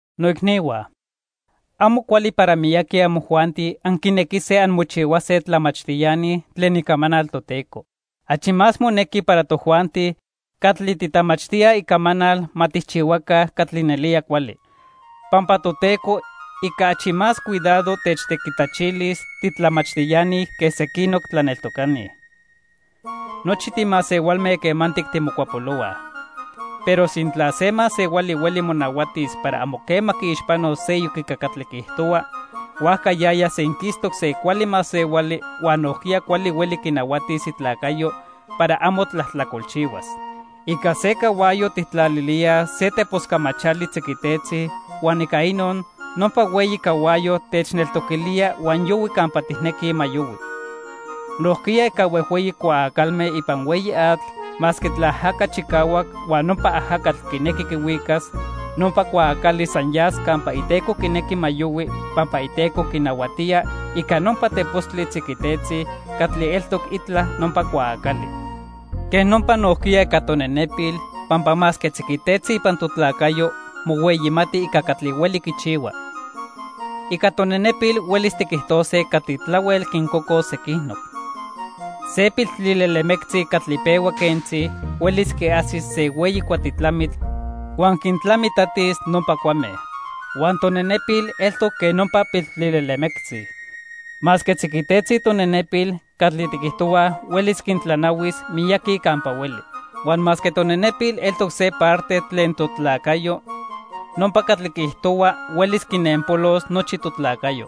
Noicnihua, amo cuali para miyaqui amojuanti anquinequise anmochihuase tlamachtiani tlen Icamanal Toteco. Achi más monequi para tojuanti catli titlamachtíaj Icamanal ma tijchihuaca catli nelía cuali. Pampa Toteco ica achi más cuidado techtequitlachilis titlamachtiani que sequinoc tlaneltocani. Nochi timasehualme quemantic timocuapolohuaj. Pero sintla se masehuali hueli monahuatis para amo quema quiixpanos seyoc ica catli quiijtohua, huajca yaya senquistoc se cuali masehuali huan nojquiya cuali hueli quinahuatis itlacayo para amo tlajtlacolchihuas. Ica se cahuayo tijtlalilíaj se tepos camachali tziquitetzi huan ica inon, nopa hueyi cahuayo techneltoquilía huan yohui campa tijnequij ma yohui. Nojquiya ica huejhueyi cuaacalme ipan hueyi atl, masque tlaajaca chicahuac huan nopa ajacatl quinequi quihuicas, nopa cuaacali san yas campa iteco quinequi ma yohui, pampa iteco quinahuatía ica nopa tepostli tziquitetzi catli eltoc itla nopa cuaacali. Quej nopa nojquiya ica tonenepil, pampa masque tziquitetzi ipan totlacayo, mohueyimati ica catli hueli quichihua. Ica tonenepil huelis tiquijtose catli tlahuel quincocos sequinoc. Se piltlilelemectzi catli pehua quentzi, huelis quiajsis se hueyi cuatitlamitl, huan quintlamitlatis nopa cuame. Huan tonenepil eltoc quen nopa piltlilelemectzi. Masque tziquitetzi tonenepil, catli tiquijtohuaj huelis quintlanahuis miyaqui campa hueli. Huan masque tonenepil eltoc se parte tlen totlacayo, nopa catli quiijtohua huelis quinenpolos nochi totlacayo.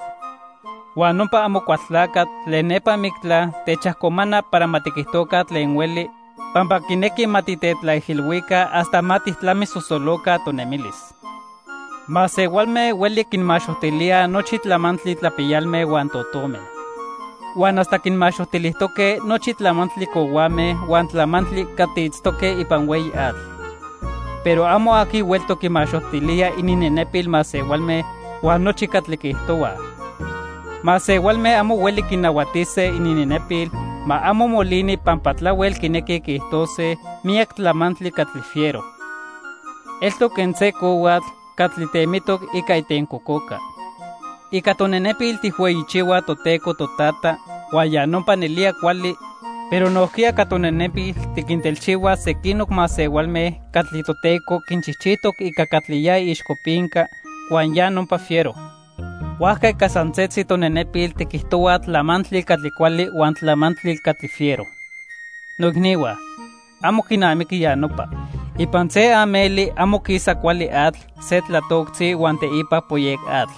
Huan nopa Amocualtlacatl tlen nepa mictla techajcomana para ma tiquijtoca tlen hueli, pampa quinequi ma titetlaijilhuica hasta ma tijtlamisosoloca tonemilis. Masehualme huelij quinmaxojtilíaj nochi tlamantli tlapiyalme huan totome. Huan hasta quinmaxojtilijtoque nochi tlamantli cohuame huan tlamantli catli itztoque ipan hueyi atl. Pero amo aqui hueltoc quimaxojtilía ininnenepil masehualme huan nochi catli quiijtohuaj. Masehualme amo hueli quinahuatise ininnenepil ma amo molini pampa tlahuel quinequij quiijtose miyac tlamantli catli fiero. Eltoc quen se cohuatl catli temitoc ica itencococa. Ica tonenepil tijhueyichihuaj Toteco Totata huan ya nopa nelía cuali, pero nojquiya ica tonenepil tiquintelchihuaj sequinoc masehualme catli Toteco quinchijchijtoc ica catli ya iixcopinca, huan ya nopa fiero. Huajca ica san setzi tonenepil tiquijtohuaj tlamantli catli cuali huan tlamantli catli fiero. Noicnihua, amo quinamiqui ya nopa. Ipan se ameli amo quisa cuali atl se tlatoctzi huan teipa poyec atl.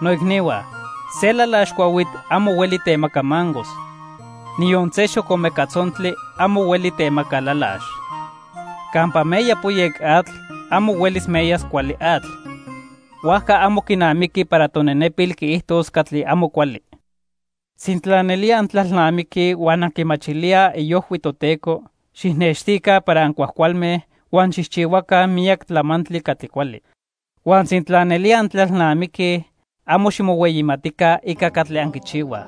Noicnihua, se lalax cuahuitl amo hueli temaca mangos. Niyon se xocomeca tzontli amo hueli temaca lalax. Campa meya poyec atl, amo huelis meyas cuali atl. Huajca amo quinamiqui para tonenepil quiijtos catli amo cuali. Sintla nelía antlalnamiquij huan anquimachilíaj iojhui Toteco, xijnextica para ancuajcualme huan xijchihuaca miyac tlamantli catli cuali. Huan sintla nelía antlalnamiquij, amo ximohueyimatica ica catli anquichihuaj.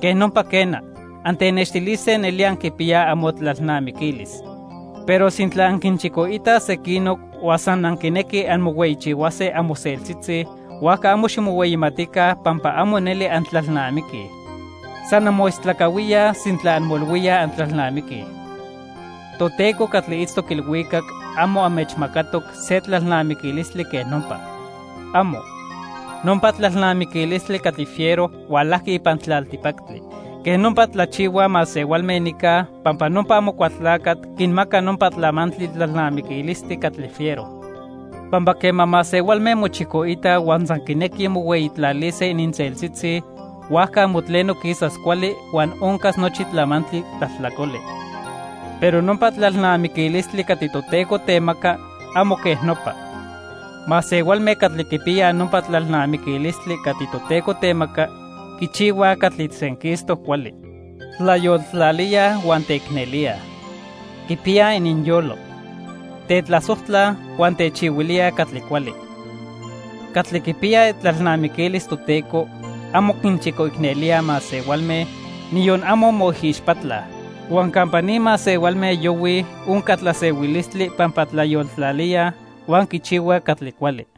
Quej nopa quena, antenextilise nelía anquipiyaj amotlalnamiquilis. Pero sintla anquinchicoitaj sequinoc huan san anquinequij anmohueyichihuase amoseltzitzi, huajca amo ximohueyimatica pampa amo neli antlalnamiquij. San anmoistlacahuíaj sintla anmoilhuíaj antlalnamiquij. Toteco catli itztoc ilhuicac amo anmechmacatoc se tlalnamiquilistli quej nopa. ¡Amo! Nopa tlalnamiquilistli catli fiero hualajqui ipan tlaltipactli. Quej nopa tlachihuaj masehualme nica, pampa nopa Amocualtlacatl quinmaca nopa tlamantli tlalnamiquilistli catli fiero. Pampa quema masehualme mochicoitaj huan san quinequij mohueyitlalise ininseltzitzi, huajca amo tleno quisas cuali huan oncas nochi tlamantli tlajtlacoli. Pero nopa tlalnamiquilistli catli Toteco temaca amo quej nopa. Masehualme catli quipiyaj nopa tlalnamiquilistli catli Toteco temaca, quichihuaj catli senquistoc cuali. Tlayoltlalíaj huan teicnelíaj. Quipiyaj ininyolo. Tetlasojtlaj huan techihuilíaj catli cuali. Catli quipiyaj itlalnamiquilis Toteco, amo quinchicoicnelíaj masehualme, niyon amo moijixpatlaj. Huan campa ni masehualme yohuij onca tlasehuilistli pampa tlayoltlalíaj huan quichihuaj catli cuali.